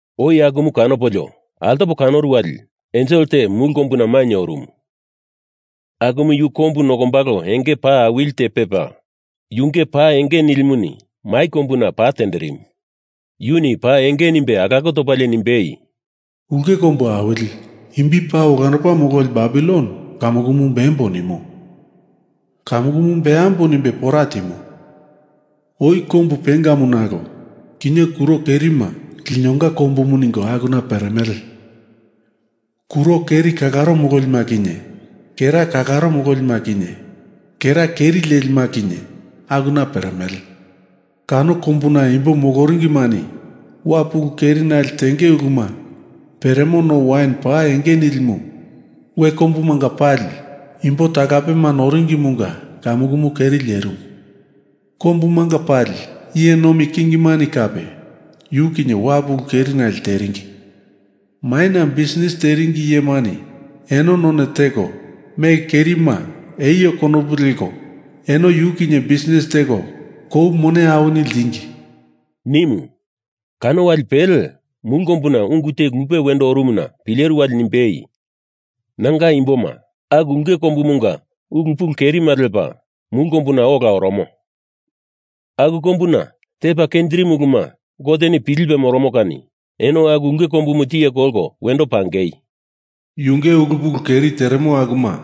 Oi akumu kanopolio, altopo kanoru wali ensel te mulu kombuna mainye orumu. Akumu yu kombu nokombalo enge paa awili te pepa, yunge pa enge nilimuni mai kombuna pa tenderimu. Yuni paa enge nimbe alako topalie nimbei, “Ulke Kombu Awili Imbi Paa Olandopa Mololi Babilon kamukumu bembo nimo. Kamukumu beambo nimbe pora timo. Oi kombu pengamu nalo kinye kuro kerima linonga kombumu ningo akuna peremele. Kuro keri kalaro mololima kinye kera kalaro mololima kinye kera keri lelima kinye akuna peremele. Kano kombuna imbo moloringimani wapu ulu kerinali tenge uluma peremo no wain paa enge nilimu we kombumanga pali imbo talapema noringimunga kamukumu keri lerimu. Kombumanga pali iye nomi kingimani kape yu kinye wapu ulu kerinale teringi. Maina bisnis teringi iyemani eno none teko mele kerima eio konopu leko eno yu kinye bisnis teko kou mone awini ltingi,” nimu. Kano wali pele, mulu kombuna ungu te lupe wendo orumuna pileru wali nimbei, “Nanga imboma, aku ulke kombumunga ulu pulu kerima lepa mulu kombuna ola oromo, aku kombuna tepa kenjirimu uluma Goteni pilipe moromo kani eno aku ulke kombumu tiye kolko wendo pangei! Yunge ulu pulu keri teremo akuma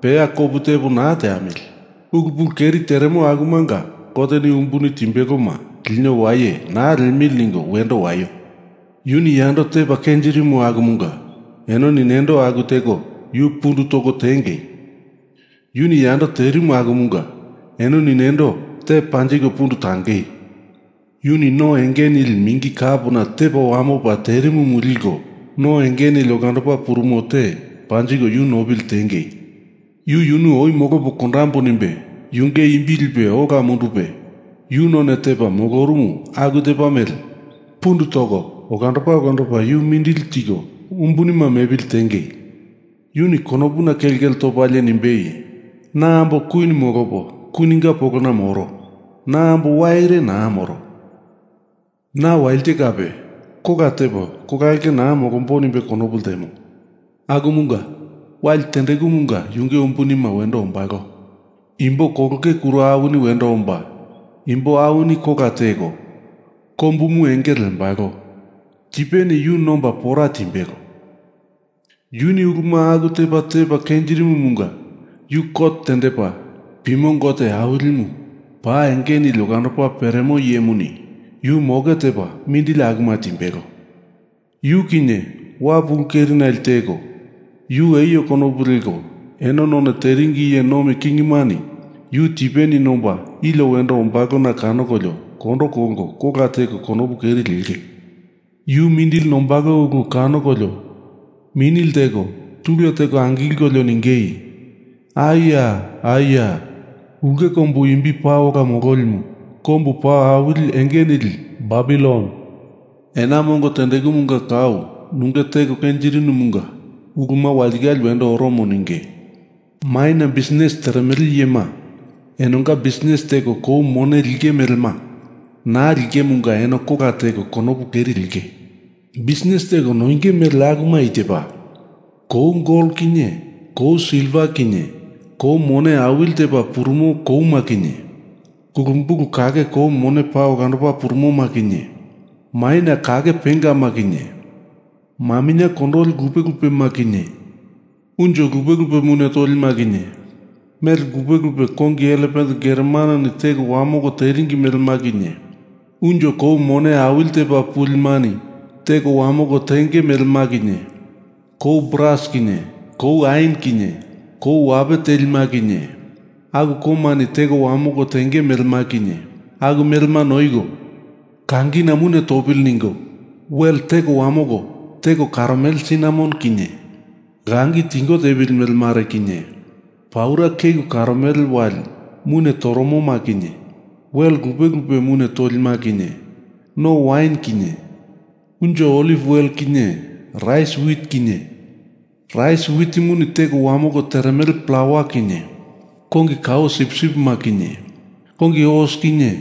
peya kopu tepo naa teamili! Ulu pulu keri teremo akumanga Goteni umbuni timbeloma lino waye naa liemili ningo wendo waio! Yuni yando tepa kenjirimu akumunga enoni nendo aku teko yu pundu toko tiengei! Yuni yando terimu akumunga enoni nendo te panjiko pundu tangei! Yuni no enge nili mingi kapona tepa wamopa terimumu liko no enge nili olandopa purumo te panjiko yu nopili tiengei! Yu yunu oi molopo kondambo nimbe yunge imbi lipe ola mundupe yu none tepa molorumu aku tepa mele pundu toko olandopa olandopa yu mindili tiko umbunima mepili tiengei! Yuni konopuna kelkele topalie nimbei, ‘Na ambo nomi kwin molopo kwininga polona moro. Na ambo waire naa moro. Na walite kape kola tepo kola ulke naa molombo,’ nimbe konopu ltemo. Akumunga wali tendekumunga yunge umbunima wendo ombalo. Imbo kolonge kuro awini wendo omba, imbo awini kola teko, kombumu engele lembalo. Tipeni yu nomba pora timbelo. Yuni uluma aku tepa tepa kenjirimomunga yu kot tendepa pimo Gote Awilimu paa enge nili olandopa peremo iyemuni yu moke tepa mindili akuma timbelo. Yu kinye wapu ulu kerinali teko, yu eio konopu leko eno none teringi iye nomi kingimani yu tipeni nomba ilio wendo ombalona kanokolio kondo kolko kola teko konopu keri lenge. Yu mindili nombalo ulu kanokolio mini lteko tule teko angilkolio ningei, ‘Ai ya! Ai ya! Ulke kombu imbi paa ola mololimu, kombu paa awili enge nili Babilon! Ena mongo tendekumunga kau nunge teko kenjirinumunga uluma walitikale wendo oromo,’ ninge. “Maina bisnis teremele iyema enonga bisnis teko kou mone linge melema naa lingemunga eno kola teko konopu keri lenge. Bisnis teko noinge mele akuma i tepa: Kou gol kinye kou silva kinye kou mone awili tepa purumo kouma kinye kulumbulu kake kou mone paa olandopa purumoma kinye maminye kake pengama kinye, maminye kondoli lupe lupema kinye, unjo lupe lupe mune tolima kinye, mele lupe lupe kongi elepen geromanoni teko wamoko teringi melema kinye, unjo kou mone awili tepa pulimani teko wamoko tenge melema kinye, kou bras kinye kou ain kinye kou wape telima kinye aku koumani teko wamoko tenge melema kinye, aku melema noiko, kangina mune topili ningo wel teko wamoko, teko karomele sinamon kinye langi tingo tepili mele mare kinye, paura keku karomele wali mune toromoma kinye, wel lupe lupe mune tolima kinye, no wain kinye unjo oliv wele kinye rais wit kinye, rais witimuni teko wamoko teremele plawa kinye kongi kao sipsipima kinye kongi os kinye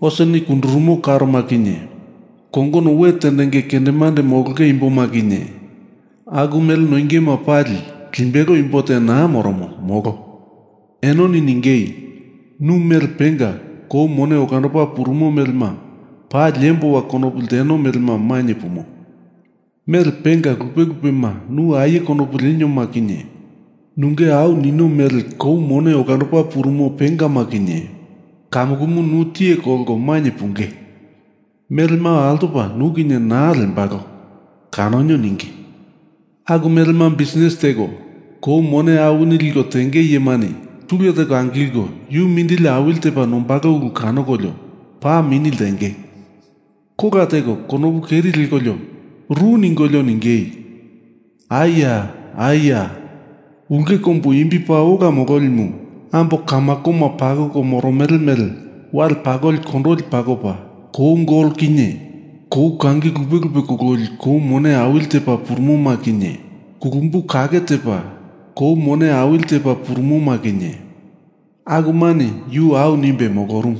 oseni kundurumo karoma kinye kongono we tendenge kendemande molonge imboma kinye; aku mele noingema pali limbelo imbo te naa moromo, molo. Enoni ningei, ‘Nu mele penga kou mone olandopa purumo melema paa liemboa konopu ltenoma mainye pumo. Mele penga lupe lupema nu aie konopu lenioma kinye nunge au nino mele kou mone olandopa purumo pengama kinye kamukumu nu tiye kolko mainye punge. Melema altopa nu kinye naa lembalo kanonio,’ ninge. Aku melema bisnis teko kou mone awini liko tenge iyemani tule teko angilko yu mindili awili tepa nombalo ulu kanokolio paa mini ltenge. Kola teko konopu keri lekolio ru ningolio ningei, ‘Ai ya! Ai ya! Ulke kombu imbi paa ola mololimu, ambo kamakoma pakoko moromele mele wale pakoli kondoli pakopa, kou gol kinye kou kangi lupe lupe kololi kou mone awili tepa purumoma kinye, kulumbu kake tepa kou mone awili tepa purumoma kinye akumani yu au nimbei molorumu.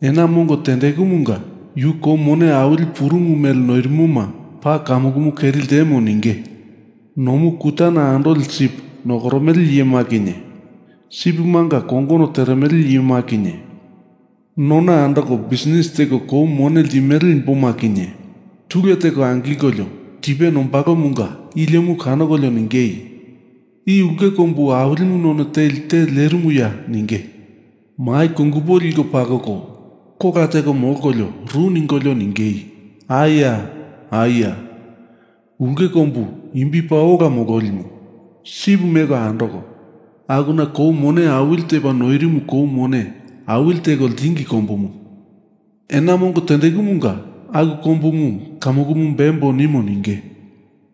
Ena mongo tendekumunga yu kou mone awili purumu mele noirimoma paa kamukumu keri ltemo,’ ninge. Nomu kutana andoli sip nokoromele iyema kinye sipimanga kongono teremele iyema kinye nona andoko bisnis teko kou mone limele imboma kinye tule teko angilkolio tipe nombalomunga iliomu kanokolio ningei, ‘I ulke kombu awilimu none teli te lerimuya?’ ninge. Mai kungupo liko pakoko kola teko molkolio ru ningolio ningei, ‘Ai ya! Ai ya! Ulke kombu imbi paa ola mololimu, sip meko andoko akuna kou mone awili tepa noirimu kou mone awili teko ltingi kombumu! Ena mongo tendekumunga aku kombumu kamukumu beambo nimo,’ ninge.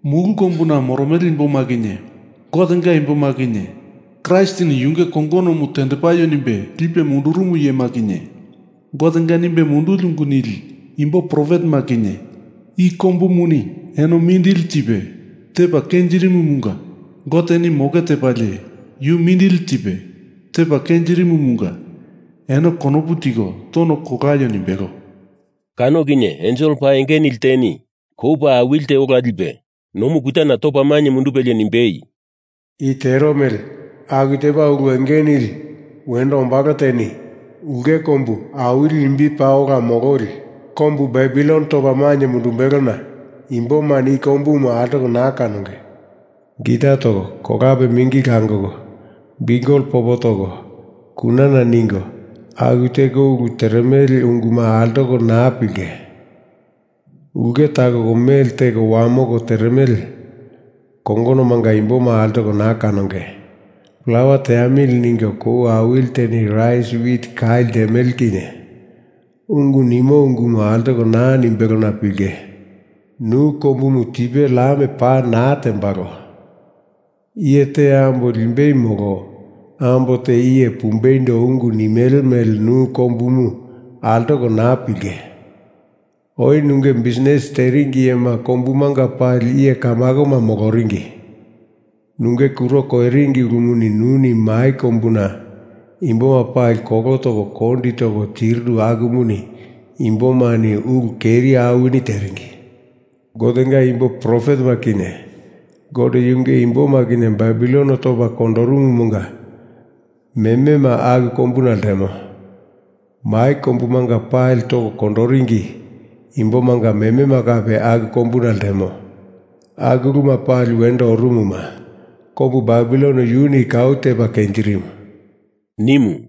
Mulu kombuna moromele imboma kinye, Gotenga imboma kinye Kraistini yunge kongonomu tendepaio nimbe lipe mundurumu iyema kinye Gotenga nimbe munduli ungu nili imbo profetema kinye i kombumuni eno mindili tipe tepa kenjirimumunga Goteni moke tepalie yu mindili tipe tepa kenjirimumunga eno konopu tiko tono kolaio nimbelo.” Kano kinye ensel paa enge nili teni kou paa awili te ola lipe nomu kutana topa mainye mundupelie nimbei, “I tero mele aku tepa ulu enge nili wendo ombalo teni ulke kombu awili imbi paa ola mololi kombu Babilon topa mainye mundumbelona imbomani i kombumu altoko naa kanonge. Gita toko, kolape mingi langoko, biukel popo toko, kunana ningo, aku teko ulu teremele unguma altoko naa pilinge. Ulke takoko mele teko wamoko teremele kongonomanga imboma altoko naa kanonge. Plawa teamili ningo kou awili teni rais wit kai ltemele kinye ungu nimo ungumu altopa naa nimbelona pilinge. Nu kombumu tipe lam pa naa tembalo. Iye te ambo limbei molo ambo te iye pumbeindo ungu nimele mele nu kombumu altoko naa pilinge. Oi nunge bisnis teringi iyema kombumanga pali iye kamakoma moloringi. Nunge kuro koiringi ulumuni nuni mai kombuna imboma pali kolo toko kondi toko tirinu akumuni imbomani ulu keri awini teringi. Gotenga imbo profetema kinye Gote yunge imboma kinye Babilononi topa kondorumumanga memema aku kombuna ltemo. Mai kombumanga pali toko kondoringi imbomanga memema kape aku kombuna ltemo. Aku uluma pali wendo orumuma kombu Babilon yuni kau tepa kenjirimu,” nimu.